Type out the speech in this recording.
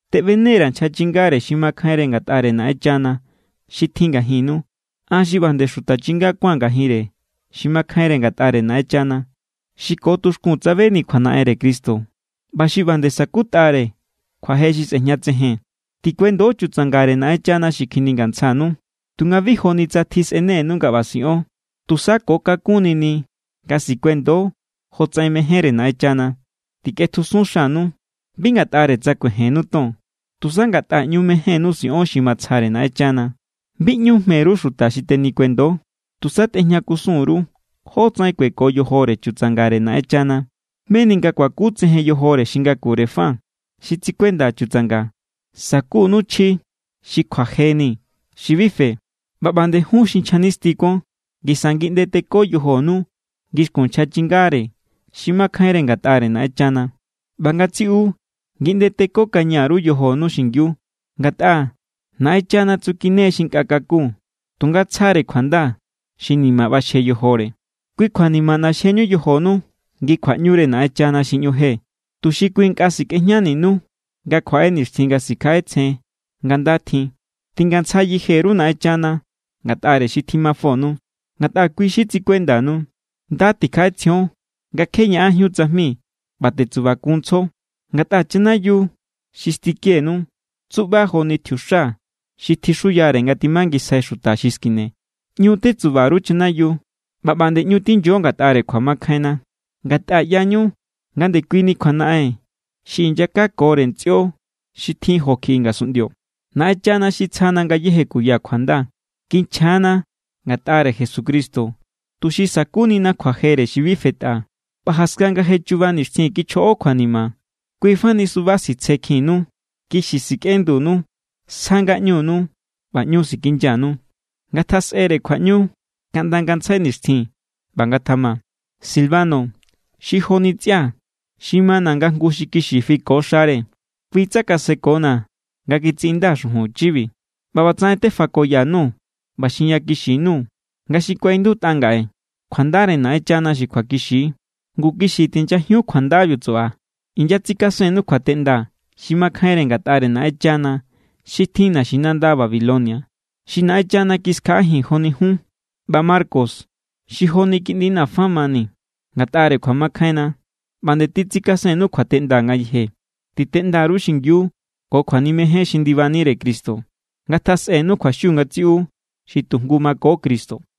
Teꞌbene_ra̱ nchja chingare xi makjainre ngatꞌare Naꞌenchana xi tjin ngajinnu, an xi ꞌba nde xuta chinga kuáa̱n ngajinre xi makjainre ngatꞌare Naꞌenchana, xi ko tuxkun tsabeni kjuanaꞌenre Cristo ꞌba xi ꞌba nde sa̱kutꞌare kjuaje xi sꞌejñatsejen. Tikuendo chutsangare Naꞌenchana xi kjiningantsjanu. Tunga bi joni tsa tjisꞌenenu nga ꞌba siꞌon, tusa ko kakún nini nga sikuendo jotsaꞌen mejénre Naꞌenchana. Tikꞌetjusun xanu bi ngatꞌare tsa kuejennu ton, tusa ngatꞌa ꞌñu mejénnu siꞌon xi matsjare Naꞌenchana. Bi ꞌñu jme_ru xuta xi tenikuendo. Tusa tꞌejña_ru kusun jótsaꞌen kueko yojore chutsangare Naꞌenchana. Meni nga kuakutsejen yojore xi ngakure fa xi tsikuenda chutsanga, sa̱kunu chji xi kjuajeni xi bi fe. ꞌBa ꞌba nde jun xi nchja nisti kuon. Ngisa ngiꞌnde teko yojonu ngixkun nchja chingare xi makjainre ngatꞌare Naꞌenchana. ꞌBa ngatsiꞌu ngiꞌnde tekokaña_ru yojonu xingiu, ngatꞌa: “Naꞌenchana tsukine= xi nkꞌa kakun, tunga tsjare kjuanda xi ni̱ma̱ ꞌbaxje yojore.” Kui kjua ni̱ma̱ ꞌnaxjeñu yojonu ngi kjuaꞌñure Naꞌenchana xi ꞌñu je, tuxi kui nkꞌa sikꞌejñaninu nga kjuaꞌe nixtjin nga sikjaꞌetsjen nga nda tjin. Tingantsja yeje_ru Naꞌenchana ngatꞌare xi tjimafonu, ngatꞌa kui= xi tsikuendanu. Nda tikjaꞌetsjion nga kje ñaꞌanjíun tsajmi ꞌba tetsubakunntsjo. Ngatꞌa chanayiu xi stikenu tsuba joni tjiuxa xi tjixuyare nga timangisjai xuta xi skine. ꞌÑu tetsuba_ru chanayiu, ꞌba nde ꞌñu tinyo ngatꞌare kjuamakjainna. Ngatꞌa ꞌyañu nga ndekuini kjuanaꞌen xi inyakakore ntsꞌio xi tjin jo kjiꞌi ngasunꞌndio. Naꞌenchana xi tsjana ngayéje kuya kjuanda kinchja=na ngatꞌare Jesucristo tuxi sa̱kunina kjuajere xi bi fetꞌa. ꞌBa jaskan nga je chuba nixtjin kichjoꞌo kjuanima, kui fani suba sitsjekjinnu, kixi sikꞌendunu, sja ngaꞌñunu ꞌba ꞌñu sikinyanu. Ngatjasꞌere kjuaꞌñu kaꞌnda ngantsjai nixtjin. ꞌBa ngatjama. Silvano xi joni ntsꞌia̱, xi mana̱ nga jngu xi kixi fiko xare, kui tsakasekona̱ nga kitsiꞌindaa̱ xujun chibi. ꞌBa ꞌbatsaꞌen tefakoya_nuu̱ ꞌba xinyakixi_nuu̱ nga xi kuaꞌindutꞌa ngaꞌe, kjuandare Naꞌenchana xi kjuakixi=. Ngu kixi tinyajiun kjuandabiu tsuꞌba. Inyatsikasennu kjuateꞌnda xi makjainre ngatꞌare Naꞌenchana xi tjin naxinanda Babilonia, xi Naꞌenchana kiskjaꞌajin joni jun. ꞌBa Marcos xi joni kiꞌndina̱ fa mani ngatꞌare kjuamakjainna, ꞌba nde titsikasennu kjuateꞌnda ngayeje. Titeꞌnda_ru xingiu ko kjuanimejen xi ndibanire Cristo. Ngatjasꞌenu kjuaxiu ngatsiꞌu xi tu jngu mako Cristo.